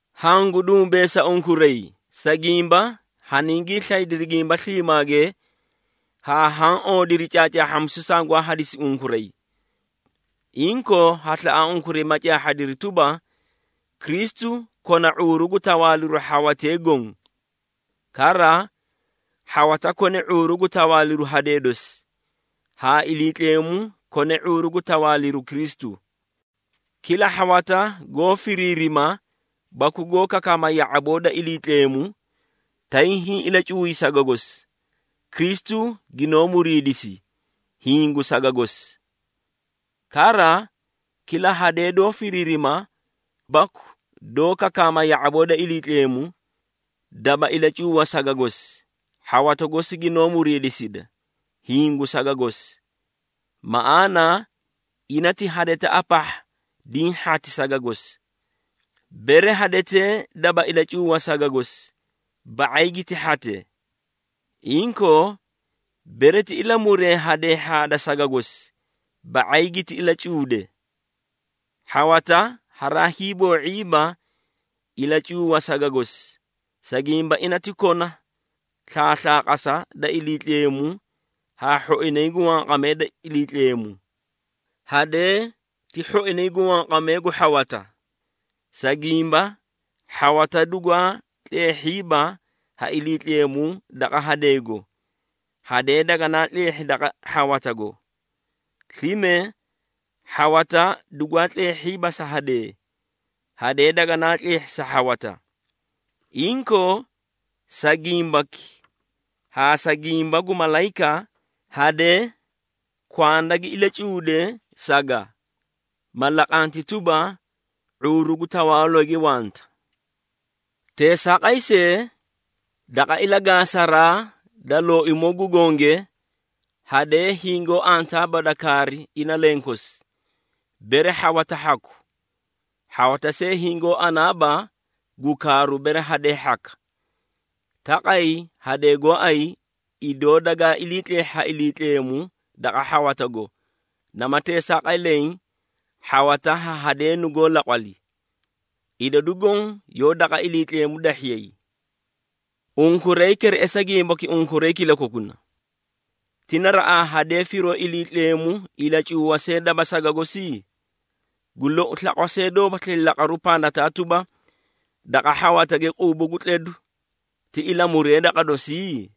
Hangu dumbeesa unkuray, sa gimba haningii slaydiri gimba sliimaage haa haã oodiri caacaahhamisu sangwaa hadisi unkuray. Inkoo, ha slaꞌa unkuray ma caahhadiri tuba, Kristu kona ⁄uuru gu tawaaliru hhawatee goõ. Kara, hhawata kone ⁄uuru gu tawaaliru hadee dosi, haa Iliitleemu kone ⁄uuru gu tawaaliru Kristu. Kila hhawata goó firirima baku goó kakaama ya⁄aboo da Iliitleemu, tay hiĩ ilacuuy saga gosi, Kristu ginoó muriidisi, hiĩ gu saga gosi. Kara, kila hadee doó firiirima baku doó kakaama ya⁄aboo da Iliitleemu, daba ilacuuwa saga gosi, hhawata gosi ginoó muriidisida, hiĩ gu saga gosi. Maꞌaana ina ti hadetaꞌa pahha diĩ hhati saga gosi. Bere hadee daba ilacuuwa saga gosi, ba⁄ay giti hhate. Inkoo, bere ti ilamuree hadee hhaada saga gosi, ba⁄ay giti ilacuude. Hhawata haraa hiiboo⁄iiba ilacuuwa saga gosi, sa gimba ina ti kona slaaslaqasa da Iliitleemu haa hhoinay gu wanqamee da Iliitleemu. Hadee ti hhoinay gu wanqamee gu hhawata. Sa gimba hhawata dugwaa tleehhiiba ha Iliitleemu daqa hadeego, hadee daganaa tleehhi daqa hhawatago. Slime, hhawata dugwaa tleehhiiba sa hadee, hadee daganaa tleehhi sa hhawata. Inkoo, sa gimbaki haa sa gimba gu malayika, hadee kwanda gi ilacuude saga, ma laqanti tuba, ⁄uuru gu tawaalooge wanta. Teesaaqay see, daqa ilagaasaraa da Looimoo gu Gonge, hadee hingoó antaaba da kaari ina lenkosi, bere hhawata hhaku, hhawata see hingoó anaaba gu kaaru, bere hadee hhaka. Taqay hadee gooay idoo dagaa ilii tleehhi ha Iliitleemu daqa hhawatago, nama teesaaqay leẽ hhawata ha hadee nugoó laqwali. Idadu goõ yoó daqa Iliitleemu dahhiyay. Unkuray kereꞌesa gimbaki unkuray kilakokuna. Ti naraꞌaa hadee firoo Iliitleemu ilacuuwa see daba saga gosi? Gu lou, slaqwa see doóbaslii laqaru pandataa tuba, daqa hhawatage quubu gu tledu, ti ilamuree daqa dosii?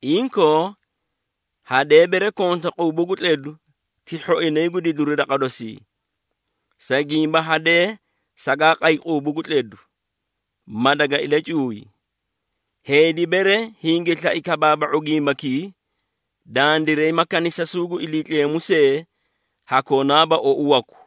Inkoo, hadee bere konta quubu gu tledu ti hhoinay gu didiru daqa dosii. Sa gimba hadee sagaa qay quubu gu tledu, ma daga ilacuuy. Heedi bere hingi slai kabaaba⁄u gimbakii, dandiray ma kanisasuu gu Iliitleemu see ha konaaba ou waku.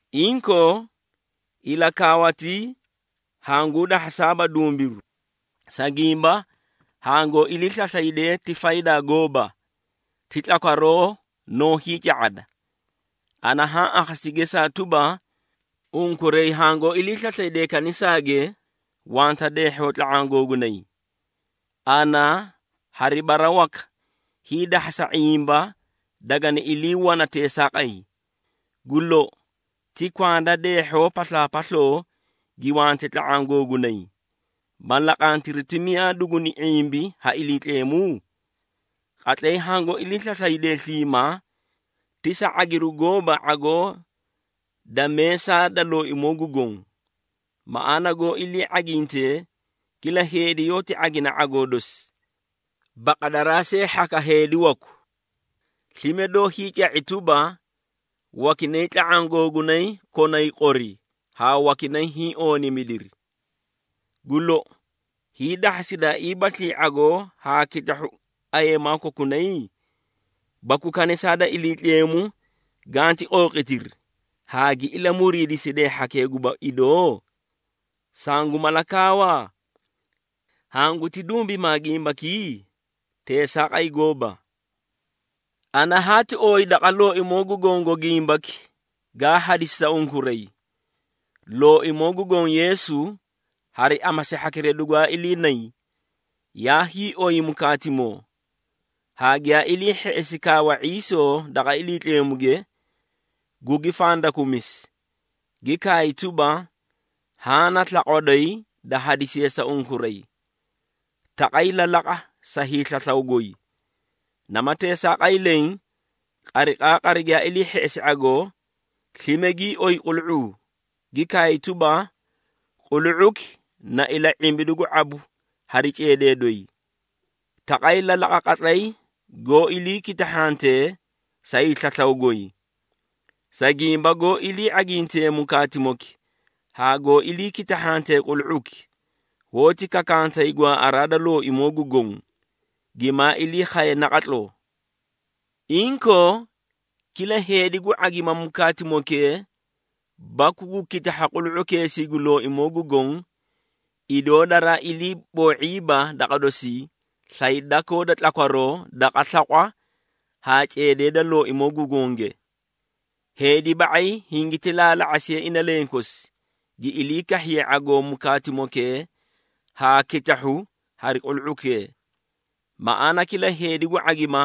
Inkoo, ilakaawatii hanguu dahhasaaba dumbiru, sa gimba hangoó ilii slaslaydee ti faydaa gooba. Ti tlakwaroo noó hiica⁄ada. Ana haã akhasi gesaa tuba, unkuray hangoó ilii slaslaydee kanisaage, wanta deehhoo tla⁄aã googunay. Ana hari bara waka hiidahhasa ⁄imba dagani ilii wana teesaaqay. Gu lou, ti kwanda deehhoo paslaapasloo gi wante tla⁄aã googunay, ma laqantiri ti miyaa duguni ⁄imbi ha Iliitleemu? Qatlay hangoó ilii slaslaydee sliimaa, ti sa ⁄agiru gooba ⁄agoo da meesaa da Looimoo gu Goõ. Maꞌaana goó ilii ⁄agintee, kila heedi yoóti ⁄agina ⁄agoo dosi, baqadaraa see hhaka heedi waku. Slime doó hiica⁄i tuba, wakinay tla⁄aã googunay konay qori, haa wakinay hiĩ ooniimidiri. Gu lou, hiidahhasidaaiibaslii ⁄agoo haa kitahhu ayeemaa kokunay? Baku kanisaa da Iliitleemu ganti qooqitiri, haa gi ilamuriidisiday hhakee guba idoo? Sangu mala kaawa? Hanguti dumbimaa gimbakii? Teesaaqay gooba! Ana haati ooyi daqa Looimoo gu Gongo gimbaki, gaa hadisi sa unkuray. Looimoo gu Goõ Yeesu hari amasi hhakira dugwaa iliinay, yaa hiioy mukaatimoo, haa giyaa ilii hheꞌesi kaawa ⁄iisoo daqa Iliitleemuge, gugi fandakumisi, gi kaay tuba, “Haã na slaqwa doyi da hadisiye sa unkuray. Taqay lalaqa sa hiislaslaw goy.” Nama teesaaqay leẽ, qariqaaqari giyaa ilii hheꞌesi ⁄agoo, slime gii oyi qulu⁄uu, gi kaay tuba, “Qulu⁄uki na ila⁄imbidu gu ⁄abu hari ceedee doyi. Taqay lalaqa qatlay goó ilii kitahhantee sa hiislaslaw goy.” Sa gimba goó ilii ⁄aginte mukaatimoki haa goó ilii kitahhatee qulu⁄uki, hoóti kakantay gwaaꞌaraa da Looimoo gu Goõ, gimaa ilii khaye naqatloo. Inkoo, kila heedi gu ⁄agima mukaatimokee baku gu kitahha qulu⁄ukeesii gu Looimoo gu Goõ, idoo daraa ilii boo⁄iiba daqa dosii, slay dakoo da tlakwaroo daqa slaqwa haa ceedee da Looimoo gu Gonge. Heedi ba⁄ay hingiti laalaa⁄asiye ina lenkosi, gi ilii kahhiye ⁄agoo mukaatimokee haa kitahhu hari qulu⁄ukee. Maꞌaana kila heedi gu ⁄agima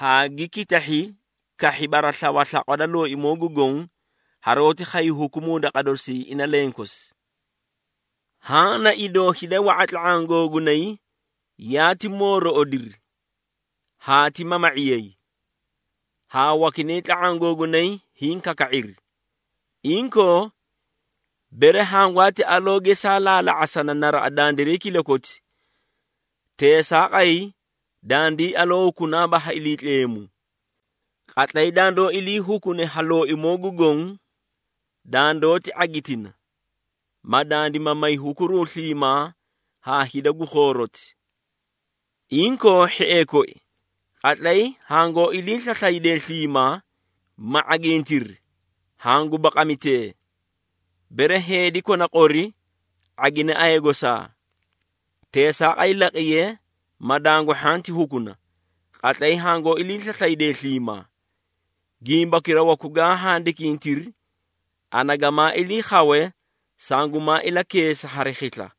haa gi kitahhi kahhi baraslawa slaqwa da Looimoo gu Goõ, haroóti khay hukumuu daqa dosii ina lenkosi. Haã na idoo hida wa⁄a tla⁄aã googunay yaati moorooꞌodiri haa ti mama⁄iyay, haa wakinay tla⁄aã googunay hiĩ kaka⁄iri. Inkoo, bere hangwaati aloo gesaa laalaa⁄asana naraꞌa dandiray kilakoti, teesaaqay dandii aloo hukunaaba ha Iliitleemu. Qatlay dandoó ilii hukune ha Looimoo gu Goõ, dandoóti ⁄agitina, ma dandima may hukuruu sliimaa haa hida gu khooroti. Inkoo, hhiee koi, qatlay hangoó ilii slaslaydee sliimaa, ma ⁄agintiri, hangu baqamitee. Bere heedi kona qori, ⁄agine aya gosaa. Teesaaqay laqiye, ma dangu hhanti hukuna, qatlay hangoó ilii slaslaydee sliimaa. Gimbakira waku gaa handikintiri, ana gamaa ilii khawe sangumaa ilakeesa hari khisla.